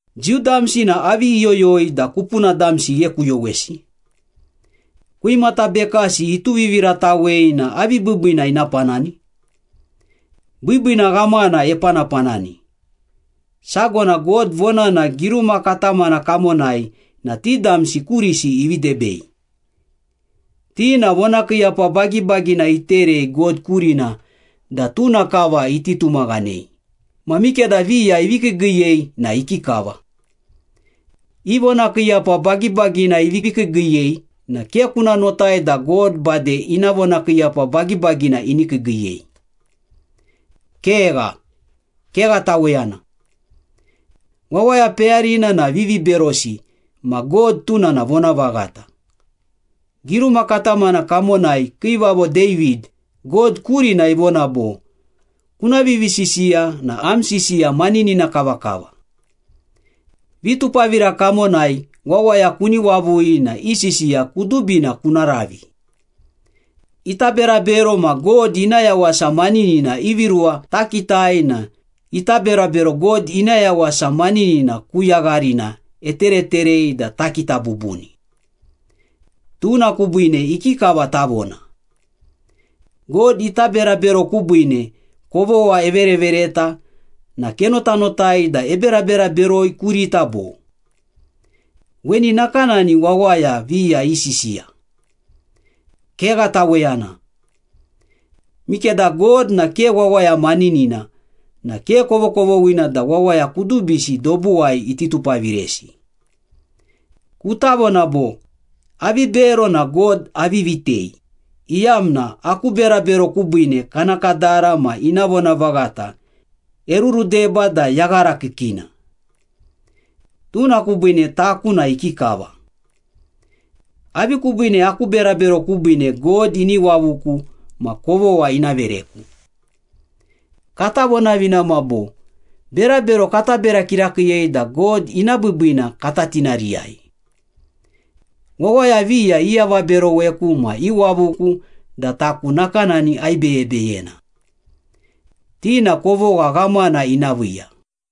Jiu damsi na avi iyoyoi da kupuna damsi ighekuyowesi? Kwimata bekasi ituviviratawei na avi biibiina ina panani? Biibiina ghamana epanapanani. Sago na God vonana giruma katamana kamonai na ti damsi kurisi ivi debei. Ti na vonakiiyapa bagibagina iterei God kurina da tuna kava iti tumaghanei, ma mikeda viya ivi kiigiiyei na ikikava? I vonakiiyapa bagibagina ivi kiigiiyei na ke kuna notai da God bade ina vonakiiyapa bagibagina ini kiigiiyei. Kegha, kegha taweyana. Wawaya peyarina na viviberosi ma God tuna na vonavaghata. Giruma katamana kamonai Kiivavo David, God kurina ivona bo, “Kuna vivisisiya na am sisiya maninina kavakava. Vitupavira kamonai wawaya kuni wavui na i sisiya kudubina kuna ravi.” Ita berabero ma God ina yawasa maninina ivi ruwa takitai na ita berabero God ina yawasa maninina ku yagharina etereterei da takita bubuni. Tuna kubiine ikikava tavona? God ita berabero kubiine kovogha everevereta na kenotanotai da eberabera beroi kurita bo? Weni nakanani wawaya viya isisiya. Kegha taweyana. Mikeda God na ke wawaya maninina na ke kovokovoghina da wawaya kudubisi dobuwai iti tupaviresi. Kuta vona bo, “Avi bero na God avi vitei, iyamna aku berabero kubiine kana kadara ma ina vonavaghata erurudeba da yaghara kiikiina. Tuna kubiine taku na ikikava? Avi kubiine aku berabero kubiine God ini wavuku ma kovogha ina vereku?” Kata vonavinama bo, “Berabero kata bera kirakiiyei da God ina biibiina kata tinariyai.” Wawaya viya iavaberoweku ma iwavuku da taku nakanani aibeyebeyena. Ti na kovogha ghamana ina viiya.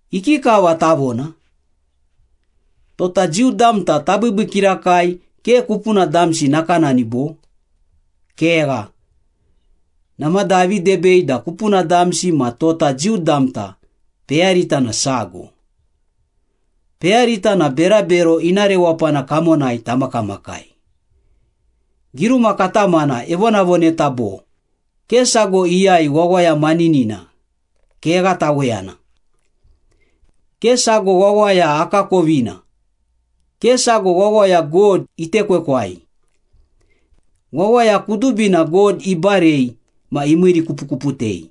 Ikikava tavona? Tota Jiu damta tabiibii kirakai ke kupuna damsi nakanani, bo? Kegha! Namada avi debei da kupuna damsi ma tota Jiu damta peyarita na sago. Peyarita na berabero ina rewapana kamonai tamakamakai. Giruma katamana evonavoneta bo, “Ke sago iyai wawaya maninina, kegha taweyana. Ke sago wawaya akakovina, Ke sago wawaya God itekwekwai. Wawaya kudubina God ibarei ma imiirikupukuputei.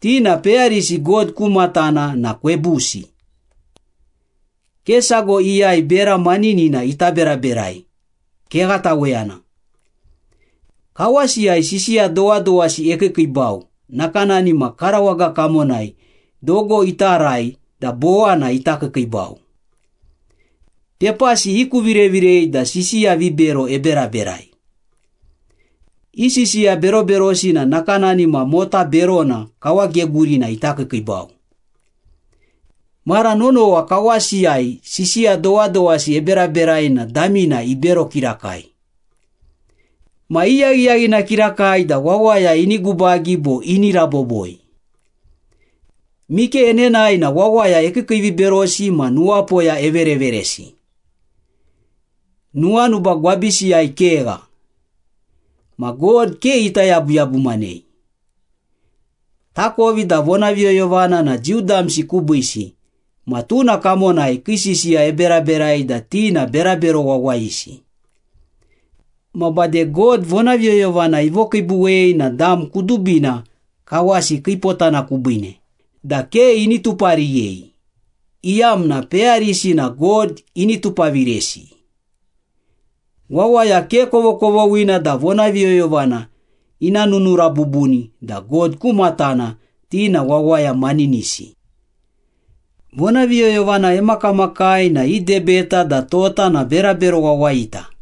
Ti na peyarisi God ku matana na kwebusi. Ke sago iyai bera maninina ita beraberai, kegha taweyana. Kawasiyai sisiya dowadowasi ekiikiibau nakanani ma karawaga kamonai dogo ita arai da bowana ita kiikiibau. Pepasi ikuvirevirei da sisiya vibero eberaberai. I sisiya beroberosi na nakanani ma mota berona kawagegurina ita kiikiibau. Mara nonowa kawasiyai sisiya dowadowasi eberaberai na damina ibero kirakai. Ma iyaghiyaghina kirakai da wawaya ini gubagi bo ini raboboi. Mike enenae na wawaya ekiikiiviberosi ma nuwapoya evereveresi. Nuwanuba gwabisiyai kegha. Ma God ke ita yabuyabumanei.” Takovi da vonaviyoyovana na Jiu damsi kubiisi ma tuna kamonai kii sisiya eberaberai da ti na berabero wawayisi. Ma bade God vonaviyoyovana ivokiibuwei na dam kudubina kawasi kiipotana kubiine da ke ini tupariyei, iyamna peyarisi na God ini tupaviresi. Wawaya ke kovokovoghina da vonaviyoyovana ina nunura bubuni da God ku matana ti na wawaya maninisi. Vonaviyoyovana emakamakai na idebeta da tota na berabero wawayita.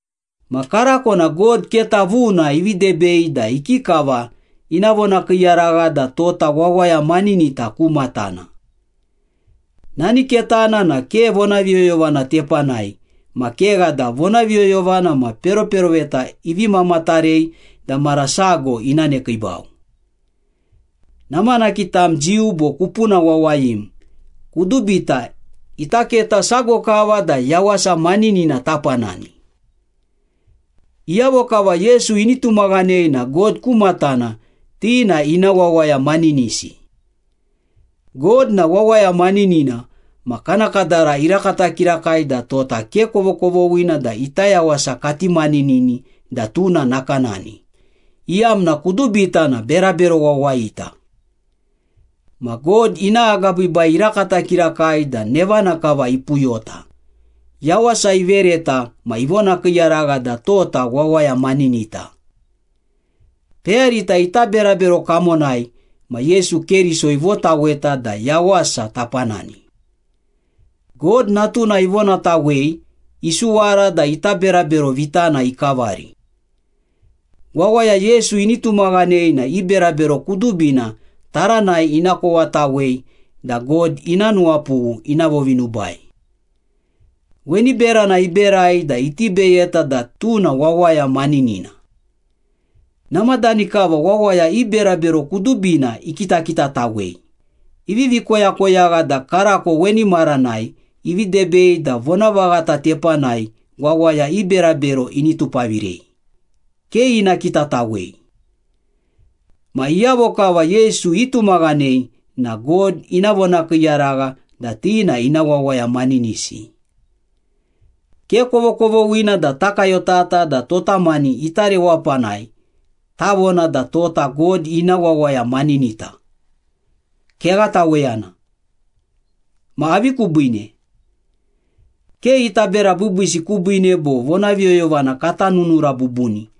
Ma karako na God keta vuna ivi debei da ikikava ina vonakiiyaragha da tota wawaya maninita ku matana. Nani ketana na ke vonaviyoyovana tepanai ma kegha da vonaviyoyovana ma peroperoveta ivi mamatarei da mara sago ina nekiibau. Namanaki tam Jiu bo kupuna wawayim, kudubita ita keta sago kava da yawasa maninina tapanani. Iyavo kava Yesu ini tumaghanei na God ku matana ti na ina wawaya maninisi. God na wawaya maninina ma kana kadara irakata kirakai da tota ke kovokovoghina da ita yawasa kati maninini da tuna nakanani, iyamna kudubita na berabero wawayita. Ma God ina agabiibai irakata kirakai da nevana kava ipuyota, yawasa ivereta ma ivonakiiyaragha da tota wawaya maninita. Peyarita ita berabero kamonai ma Yesu Keriso ivotaweta da yawasa tapanani. God Natuna ivonatawei isuwara da ita berabero vitana ikavari. Wawaya Yesu ini tumaghanei na i berabero kudubina taranai ina kowatawei da God ina nuwapughu ina vovinubai. Weni berana iberai da iti beyeta da tuna wawaya maninina. Namadani kava wawaya i berabero kudubina ikitakitatawei, ivivi koyakoyagha da karako weni maranai ivi debei da vonavaghata tepanai wawaya i berabero ini tupavirei, ke ina kitatawei. Ma iyavo kava Yesu itumaghanei na God ina vonakiiyaragha da ti na ina wawaya maninisi. Ke kovokovoghina da takayotata da tota mani ita rewapanai tavona da tota God ina wawaya maninita. Kegha taweyana. Ma avi kubiine? Ke ita bera biibiisi kubiine bo vonaviyoyovana kata nunura bubuni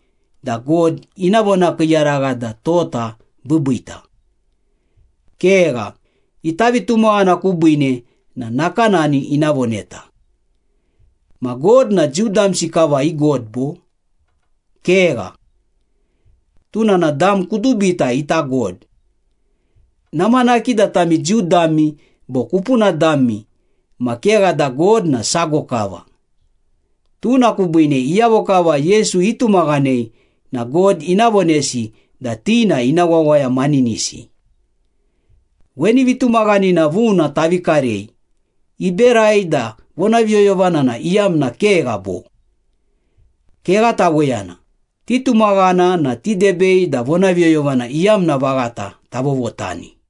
da God ina vonakiiyaragha da tota biibiita. Kegha, ita vitumaghana kubiine na nakanani ina voneta. Ma God na Jiu damsi kava i God bo? Kegha. Tuna na dam kudubita ita God. Namanaki da tami Jiu dami bo kupuna dami ma kegha da God na sago kava. Tuna kubiine iyavo kava Yesu itumaghanei na God ina vonesi da ti na ina wawaya maninisi. Weni vitumaghanina vuna tavi karei iberai da vonaviyoyovana na iyamna kegha, bo? Kegha taweyana, titumaghana na tidebei da vonaviyoyovana iyamna vaghata tavovotani.